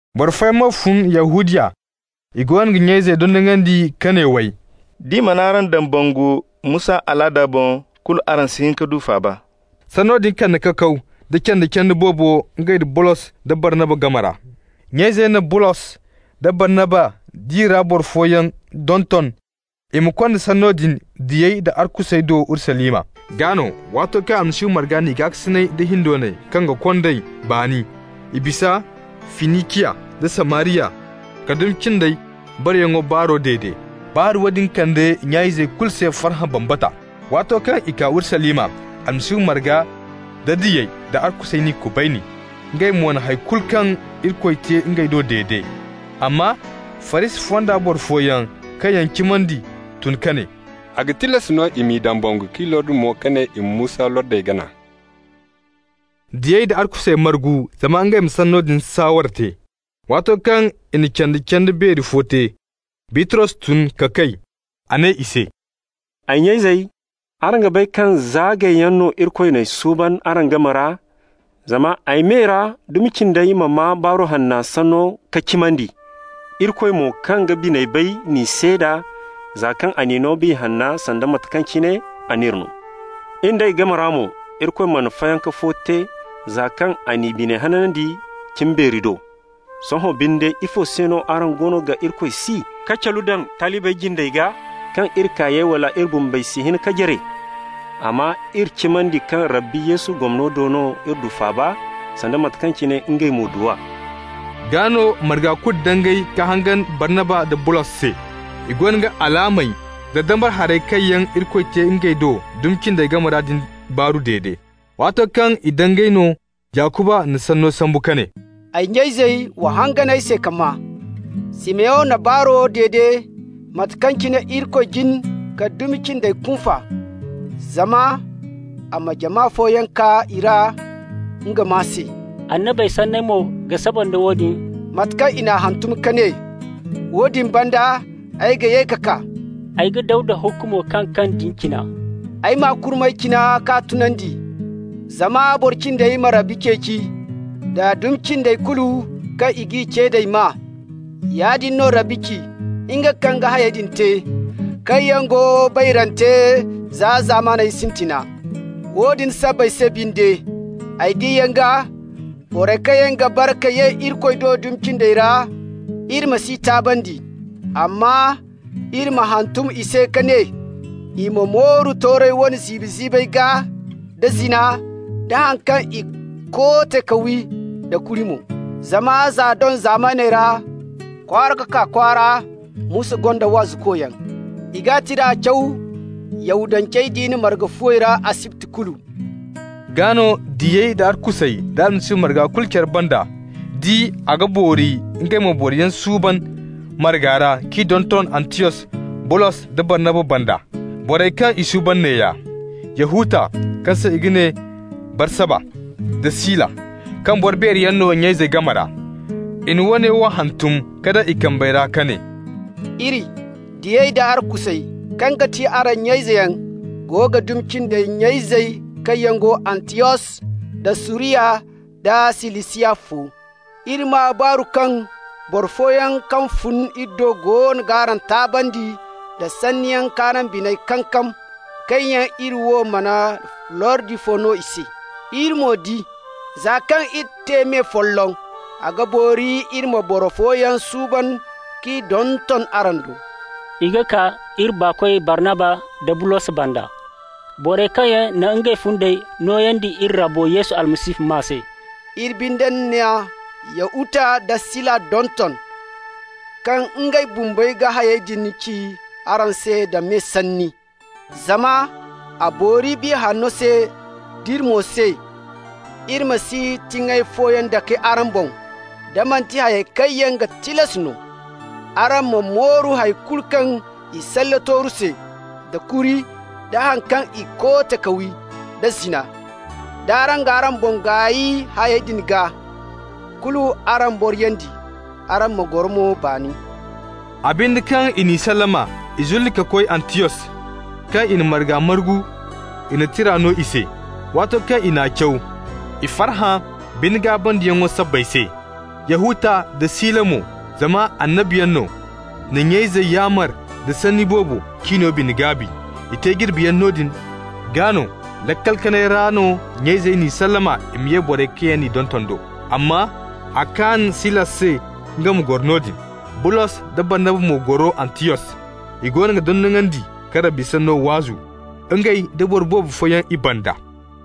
Boro fooyaŋ mo fun Yahudiya. I goono ga nya-izey dondonandi ka ne, way: «D'i mana araŋ dambangu Musa alaada boŋ, kulu araŋ si hin ka du faaba.» Sanno din kande kakaw da canda-canda boobo ngey nda Bulos da Barnaba game ra. Nya-izey na Bulos da Barnaba nd'i ra boro fooyaŋ donton i ma konda sanno din diyey da arkusey do Urusalima. Gaa no, waato kaŋ Almasihu marga n'i gaakasinay da hindoonay kaŋ ga kond'ey baani, i bisa Finiciya da Samariya ka dumi cindey bareyaŋo baaro dede. Baaru woodin kande nya-izey kulu se farhã bambata. Waato kaŋ i kaa Urusalima, Almasihu marga nda diyey da arkusey n'i kubayni. Ngey mo na hay kulu kaŋ Irikoy te ngey do dede. Amma Farisi fonda boro fooyaŋ kaŋ yaŋ cimandi tun ka ne: «A ga tilas no i m'i dambangu k'i lordi mo ka ne i ma Musa lordey gana.» Diyey da arkusey margu zama ngey ma sanno din saaware te. Waato kaŋ i na canda-canda beeri fo te, Bitros tun ka kay. A ne i se: «Ay nya-izey, araŋ ga bay kaŋ za gayyaŋ no Irikoy n'ay suuban araŋ game ra, zama ay me ra dumi cindey ma maa Baaru Hanna sanno ka cimandi. Irikoy mo, kaŋ ga biney bay n'i seeda, za kaŋ a n'i no Biya Hanna, sanda mate kaŋ cine a n'iri no. In d'ey game ra mo, Irikoy mana fayanka fo te, za kaŋ a n'i biney hanandi cimbeeri do. Sohõ binde, ifo se no araŋ goono ga Irikoy si, ka calu daŋ talibey jindey gaa kaŋ iri kaayey wala iri bumbey si hin ka jare? Amma iri cimandi kaŋ Rabbi Yesu gomno do no iri du faaba, sanda mate kaŋ cine ngey mo du a.» Gaa no marga kulu dangay ka hangan Barnaba nda Bulos se. I goono ga alaamey da dambara harey kaŋ yaŋ Irikoy te ngey do dumi cindey game ra din baaru dede. Waato kaŋ i dangay no Yakuba na sanno sambu ka ne: «Ay nya-izey, wa hangan ay se ka maa. Simeyon na baaro dede mate kaŋ cine Irikoy jin ka dumi cindey kunfa, zama a ma jama fooyaŋ kaa i ra nga maa se. Annabey sanney mo ga saba nda woodin, mate kaŋ i n'a hantum ka ne: ‹Woodin banda ay ga ye ka kaa. Ay ga Dawda hukumo kaŋ kaŋ din cina, ay m'a kurmey cina ka tunandi, zama boro cindey ma Rabbi ceeci, da dumi cindey kulu kaŋ i g'i ce d'ay maa. Yaadin no Rabbi ci, nga kaŋ ga hayey din te, kaŋ yaŋ go bayrante za zamana sintina.› Woodin sabbay se binde, ay diyaŋo gaa, borey kaŋ yaŋ ga bare ka ye Irikoy do dumi cindey ra, iri ma s'i taabandi. Amma iri ma hantum i se ka ne i ma mooru toorey wane ziibi-ziibey gaa, da zina, da haŋ kaŋ i koote ka wi, da kuri mo. Zama za doŋ zamaney ra, kwaara ka kaa kwaara Musa gonda waazukoyaŋ. I g'a tira caw Yahudance diina marga fuwey ra asibti kulu.» Gaa no diyey da arkusey da Almasihu marga kulu care banda di a ga boori ngey ma boroyaŋ suuban marga ra k'i donton Antiyos Bulos da Barnaba banda. Borey kaŋ i suuban neeya: Yahuta, kaŋ se i ga ne Barsaba, da Sila, kaŋ boro beeri yaŋ no nya-izey game ra. I na woone wo hantum ka daŋ i kambey ra ka ne: «Iri, diyey da arkusey, kaŋ ti araŋ nya-izeyaŋ, go ga dumi cindey nya-izey kaŋ yaŋ go Antiyos, da Suriya, da Silisiya fo. Iri maa baaru kaŋ boro fooyaŋ kaŋ fun iri do goono g'araŋ taabandi nda sanniyaŋ k'araŋ biney kankam, kaŋ yaŋ iri wo mana lordi fo no i se. Iri mo di, za kaŋ iri te me folloŋ, a ga boori iri ma boro fooyaŋ suuban k'i donton araŋ do. I ga kaa iri baakoy Barnaba da Bulos banda, borey kaŋ yaŋ na ngey fundey nooyandi iri Rabbo Yesu Almasihu maa se. Iri binde na Yahuta da Sila donton, kaŋ ngey bumbey ga hayey din ci araŋ se da me sanni. Zama a boori Biya Hanna se d'iri mo se, iri ma si tiŋay fooyaŋ dake araŋ boŋ da manti hayey kaŋ yaŋ ga tilas no: araŋ ma mooru hay kulu kaŋ i salle tooru se, da kuri, da haŋ kaŋ i koote ka wi, da zina. D'araŋ g'araŋ boŋ gaay hayey din gaa, kulu araŋ boriyandi. Araŋ ma goro nda baani.» A binde, kaŋ i n'i sallama, i zulli ka koy Antiyos. Kaŋ i na marga margu, i na tira no i se. Waato kaŋ i n'a caw, i farhã bine-gaabandiyaŋo sabbay se. Yahuta nda Sila mo, zama annabiyaŋ no, na nya-izey yaamar da sanni boobo k'i no bine-gaabi. I te jirbiyaŋ noodin, gaa no laakal kanay ra no nya-izey n'i sallama i ma ye borey kaŋ yaŋ n'i donton do. Amma a kaan Sila se nga ma goro noodin. Bulos da Barnaba mo goro Antiyos. I goono ga dondonandi ka Rabbi sanno waazu, ngey da boro boobo fooyaŋ i banda.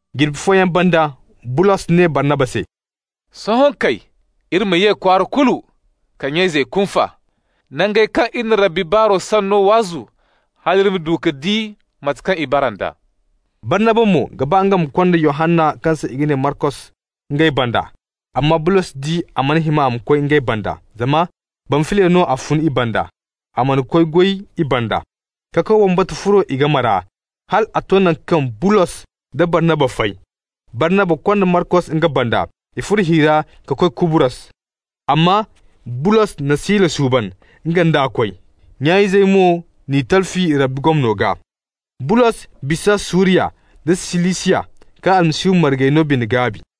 Jirbi fooyaŋ banda Bulos ne Barnaba se: «Sohõ kay iri ma ye kwaara kulu ra ka nya-izey kunfa, nangey kaŋ iri na Rabbi sanno waazu, hal iri ma du ka di mate kaŋ i bara nd'a.» Barnaba mo ga ba nga ma konda Yohanna kaŋ se i ga ne Markos ngey banda. Amma Bulos di a mana hima a ma koy ngey banda, zama Bamfiliya no a fun i banda, a mana koy goy i banda. Kakaw bambata furo i game ra hal a to naŋ kaŋ Bulos da Barnaba fay. Barnaba konda Markos nga banda. I furo hi ra ka koy Kubrus. Amma Bulos na Sila suuban, nga nd'a koy. Nya-izey mo n'i talfi Rabbi gomno gaa. Bulos bisa Suriya da Silisiya ka Almasihu margey no bine-gaabi.